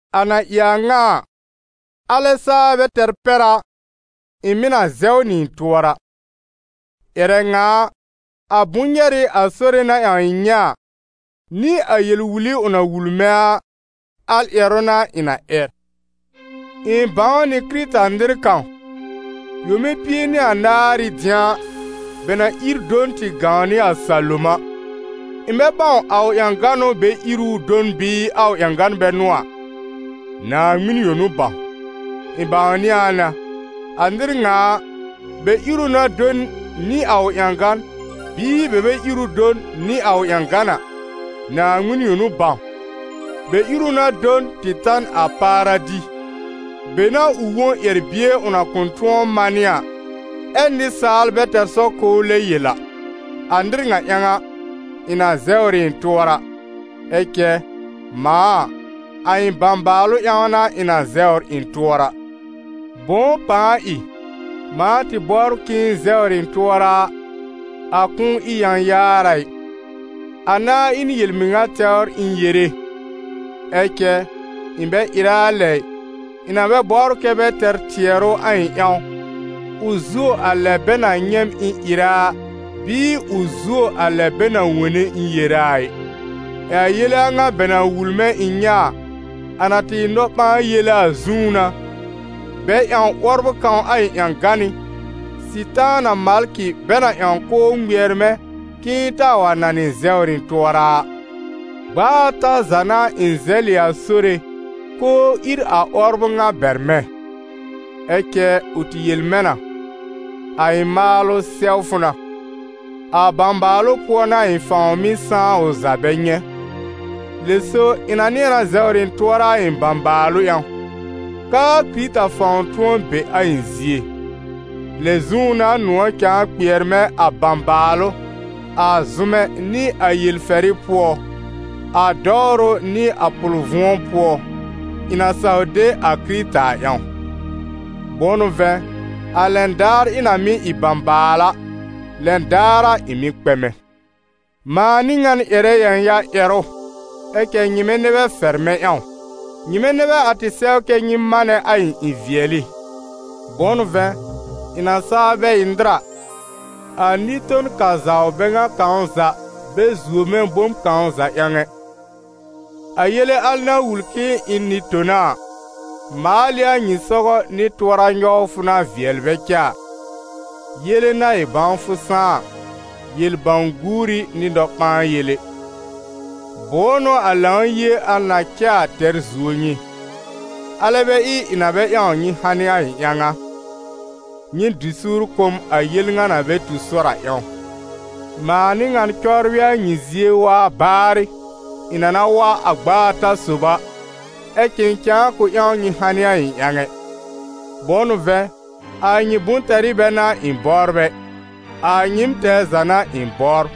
A na ɩ a ŋa a, alɛ saa bɛ tɛr pɛr a, ɩ̃ mɩ̀ na zɛw nɩ ɩ̃ tʋɔra. Ƴɛrɛ ŋa a, a bʋ̃-nyɛrɩ a Sore na ƴãw ɩ̃ nyɛ̃ a, nɩ a yel-wuli ʋ na wul mɛ̃ a, al ƴɛrʋ n'a ɩ̃ na ƴɛr. Ɩ̃ bãw nɩ Kɩrɩta-nɩr kãw, yome pie nɩ anaar ɩ dɩ̃a, bɛ na ír do n tɩ gãw nɩ a salom a. Ɩ̃ bɛ bãw a ʋ ƴãgan n'ʋ bɛ ír ɩ ʋ do n bɩɩ a ʋ ƴãgan bɛ n'ʋ a, Naaŋmɩn yõ n'ʋ bãw. Ɩ̃ bãwnɩ a na, a nɩr ŋa a, bɛ ír ʋ na do n nɩ a ʋ ƴãgan, bɩɩ bɛ bɛ ír ʋ do n nɩ a ʋ ƴãgan a, Naaŋmɩn yõ n'ʋ bãw, bɛ ír ʋ na do n tɩ ta n a Paradi, be n'a ʋ wõ ƴɛr-bie ʋ na kʋ̃ tʋ̃ɔ manɩ a, ɛ́ nɩsaal bɛ tɛr sɔr k'ʋʋ lɛb yel a. A nɩr ŋa ƴãw a, ɩ̃ na zɛwr ɩ ɩ̃ tʋɔra. Ɛ cɛ, mãa a, a ɩ̃ bãbaalʋ ƴãw n'a ɩ̃ na zɛwr ɩ̃ tʋɔra. Bʋ̃ʋ pãa ɩ? Mãa tɩ bɔbr k'ɩ̃ɩ zɛwr ɩ̃ tʋɔra a, a kʋ̃ʋ ɩ yãyaar a ɩ, a nãá ɩ n yel-mɩŋa tɛwr ɩ̃ yere, ɛ cɛ ɩ̃ bɛ ɩrɛ a lɛ ɩ, ɩ̃ na bɛ bɔbr kɛ́ bɛ tɛr tɩɛrʋ a ɩ̃ ƴãw, ʋ zuo a lɛ bɛ na nyɛ̃ m ɩ̃ ɩrɛ a, bɩɩ ʋ zuo a lɛ bɛ na wone ɩ̃ yere a ɩ. Ɛ a yele a ŋa bɛ na wul mɛ̃ ɩ̃ nyɛ̃ a, a na tɩ ɩ nɔ-ɓãa-yele a zũú n'a, bɛ ƴãw 'wɔbrʋ kãw a ɩ̃ ƴãgánɩ́, Sɩtaana malkɩ bɛ na ƴãw k'ʋʋ ŋmɩɛr mɛ̃ k'ɩ̃ɩ taa wa nanɩ zɛwr ɩ̃ tʋɔra a. Gb'a ata za n'a ɩ̃ zɛlɩ a Sore k'ʋʋ ír a 'wɔbrʋ ŋa bɛr mɛ̃. Ɛ cɛ ʋ tɩ yel mɛ̃ na: «A ɩ̃ maalʋ sɛw fʋ na, a bãbaalʋ pʋɔ n'a a ɩ̃ fãw mɩ́ sãá ʋ za bɛ nyɛ̃.» Lɛ so ɩ̃ na nɩ̃ɛ zɛwr ɩ̃ tʋɔra a ɩ̃ bãbaalʋ ƴãw, k'aa Kɩrɩta fãw tʋ̃ɔ be a ɩ̃ zie. Lɛ zũú n'a nʋ̃ɔ̀ cãa kpɩɛr mɛ̃ a bãbaalʋ, a zʋmɛ nɩ a yel-fɛrɩ pʋɔ, a dɔwrʋ nɩ a pʋl-vʋ̃ɔ pʋɔ, ɩ̃ na saw de a Kɩrɩta a ƴãw. Bʋ̃ʋ n'ʋ vɛ̃, a lɛn daar ɩ̃ na mɩ́ ɩ bãbaal a, lɛn daar a, ɩ̃ mɩ́ kpɛmɛ. Mãa n'ɩ ŋan ƴɛrɛ yãya-ƴɛrʋ, ɛ cɛ nyɩmɛ nɛ bɛ fɛr mɛ̃ ƴãw. Nyɩmɛ nɛ bɛ a tɩ sɛw kɛ́ nyɩ manɛ a ɩ̃ ɩ-vɩɛlɩ. Bʋ̃ʋ n'ʋ vɛ̃, ɩ̃ na saa bɛ ɩ nɩr a, a nɩ-ton-kazawr bɛ ŋa kãw za bɛ zuo mɛ̃ bom kãw za ƴãw ɛ. A yele al na wul k'ɩ̃ɩ ɩ n nɩ-tona a, maal ɩ a nyɩ sɔgɔ nɩ tʋɔra nyɔwfʋ na vɩɛl bɛ cɛ a: yele na ɩ bãwfʋ sãá a, yel-bãw-guuri nɩ nɔ-ɓãa-yele. Bʋ̃ʋ n'ʋ a Lãw-yie al na cɛ a tɛr zuo nyɩ? Alɛ bɛ ɩ ɩ̃ na bɛ ƴãw nyɩ hanɩ a ɩ̃ ƴãw a? Nyɩ dɩ suur kʋ̀ m a yel ŋa na bɛ tu sɔr a ƴãw. Mãa n'ɩ ŋan cɔbrɩ a nyɩ zie waa baarɩ, ɩ̃ na na wa a gb'a ata sob a, ɛ cɛ ɩ̃ cãa kʋ̃ ƴãw nyɩ hanɩ a ɩ̃ ƴãw ɛ. Bʋ̃ʋ n'ʋ vɛ̃, a nyɩ bʋ̃-tɛrɩ bɛ n'a ɩ̃ bɔbr ɛ, a nyɩɩm tɛɛ za n'a ɩ̃ bɔbr.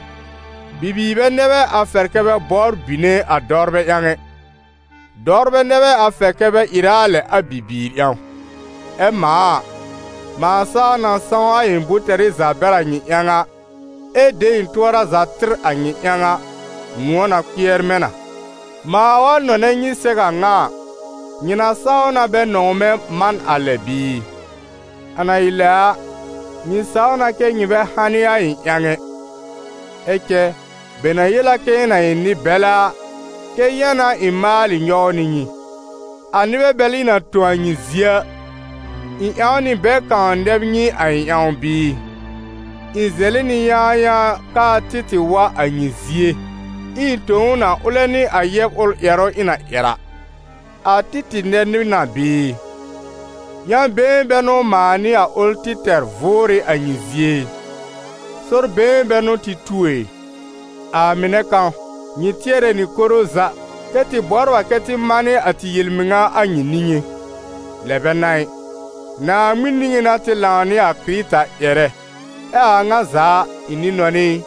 Bibiir bɛ nɛ bɛ a fɛrɛ kɛ bɛ bɔbr bine a dɔwrbɛ ƴãw ɛ, dɔwrbɛ nɛ bɛ a fɛr kɛ bɛ ɩrɛ a lɛ a bibiir ƴãw. Ɛ mãa a, mãa saa na sãw a ɩ̃ bʋ̃-tɛrɩ za bɛr a nyɩ ƴãw a, ɛ de ɩ̃ tʋɔra za tɩr a nyɩ ƴãw a, nʋ̃ɔ̀ na kpɩɛr mɛ̃ na. Mãa wa nɔnɛ nyɩ sɛw a ŋa a, nyɩ na saw na bɛ nɔ̃w mɛ̃ man a lɛ bɩɩ? A na ɩ lɛ a, nyɩ saw na kɛ́ nyɩ bɛ hanɩ a ɩ̃ ƴãw ɛ. Ɛ cɛ bɛ na yel a k'ɩ̃ɩ na ɩ nɩ-bɛlɛ a, kɛ́ yã n'a ɩ̃ maalɩ nyɔw nɩ nyɩ. A nɩbɛ bɛl ɩ̃ na tõ a nyɩ zie a, ɩ̃ ƴãw nɩ bɛ kãw nɛb nyɩ a ɩ̃ ƴãw bɩɩ? Ɩ̃ zɛlɩ nɩ yãayãa k'aa Títɩ̀ wa a nyɩ zie, ɛ ɩ̃ tõ ʋ na ʋlɛ nɩ a yɛb ʋl ƴɛrʋ ɩ̃ na ƴɛr a. A Títɩ̀ nɛb nyɩ na bɩɩ? Yã-been bɛ n'ʋ mãa nɩ a ʋl tɩ tɛr vʋʋr ɩ a nyɩ zie ɩ? Sɔr-been bɛ n'ʋ tɩ tu ɛ? A mɩnɛ kãw, nyɩ tɩɛrɛ nɩ koro za, kɛ tɩ bɔbr a kɛ tɩ manɩ a tɩ yel-mɩŋa a nyɩ niŋé. Lɛ bɛ n'a ɩ, Naaŋmɩn niŋé n'a tɩ lãw nɩ a Kɩrɩta ƴɛrɛ. Ɛ a a ŋa za a, ɩ̃ nɩ-nɔnɩ ɩ,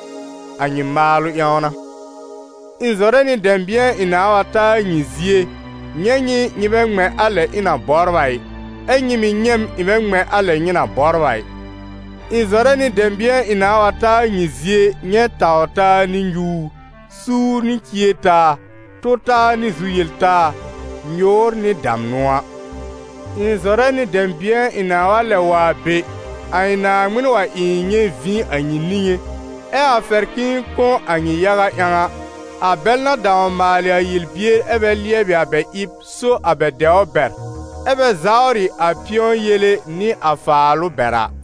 a nyɩ maalʋ ƴãw n'a. Ɩ̃ zɔrɛ nɩ dɛ̃bɩ̃ɛ ɩ̃ nãà wa ta a nyɩ zie nyɛ̃ nyɩ, nyɩ bɛ ŋmɛ̃ a lɛ ɩ̃ na bɔbr a ɩ, ɛ́ nyɩ mɩ̀ nyɛ̃ m ɩ̃ bɛ ŋmɛ̃ a lɛ nyɩ na bɔbr a ɩ. Ɩ̃ zɔrɛ nɩ dɛ̃bɩ̃ɛ ɩ̃ nãa wa ta a nyɩ zie nyɛ̃ taw-taa nɩ nyuur, suur nɩ cier-taa, tʋ-taa nɩ zu-yel-taa, nyʋʋr nɩ damnʋ a. Ɩ̃ zɔrɛ nɩ dɛ̃bɩ̃ɛ ɩ̃ nãa lɛb wa a be, a ɩ̃ Naaŋmɩn wa ɩ ɩ̃ nyɛ̃ vĩ a nyɩ niŋé, ɛ a fɛr k'ɩ̃ɩ kõ a nyɩ yaga ƴãw a, a bɛl na dãw maalɩ a yel-bier ɛ bɛ lɩɛbɩ a bɛ ɩb so a bɛ dɛwr bɛr, ɛ́ bɛ zawrɩ a pɩ̃ɔ yele nɩ a faalʋ bɛr a.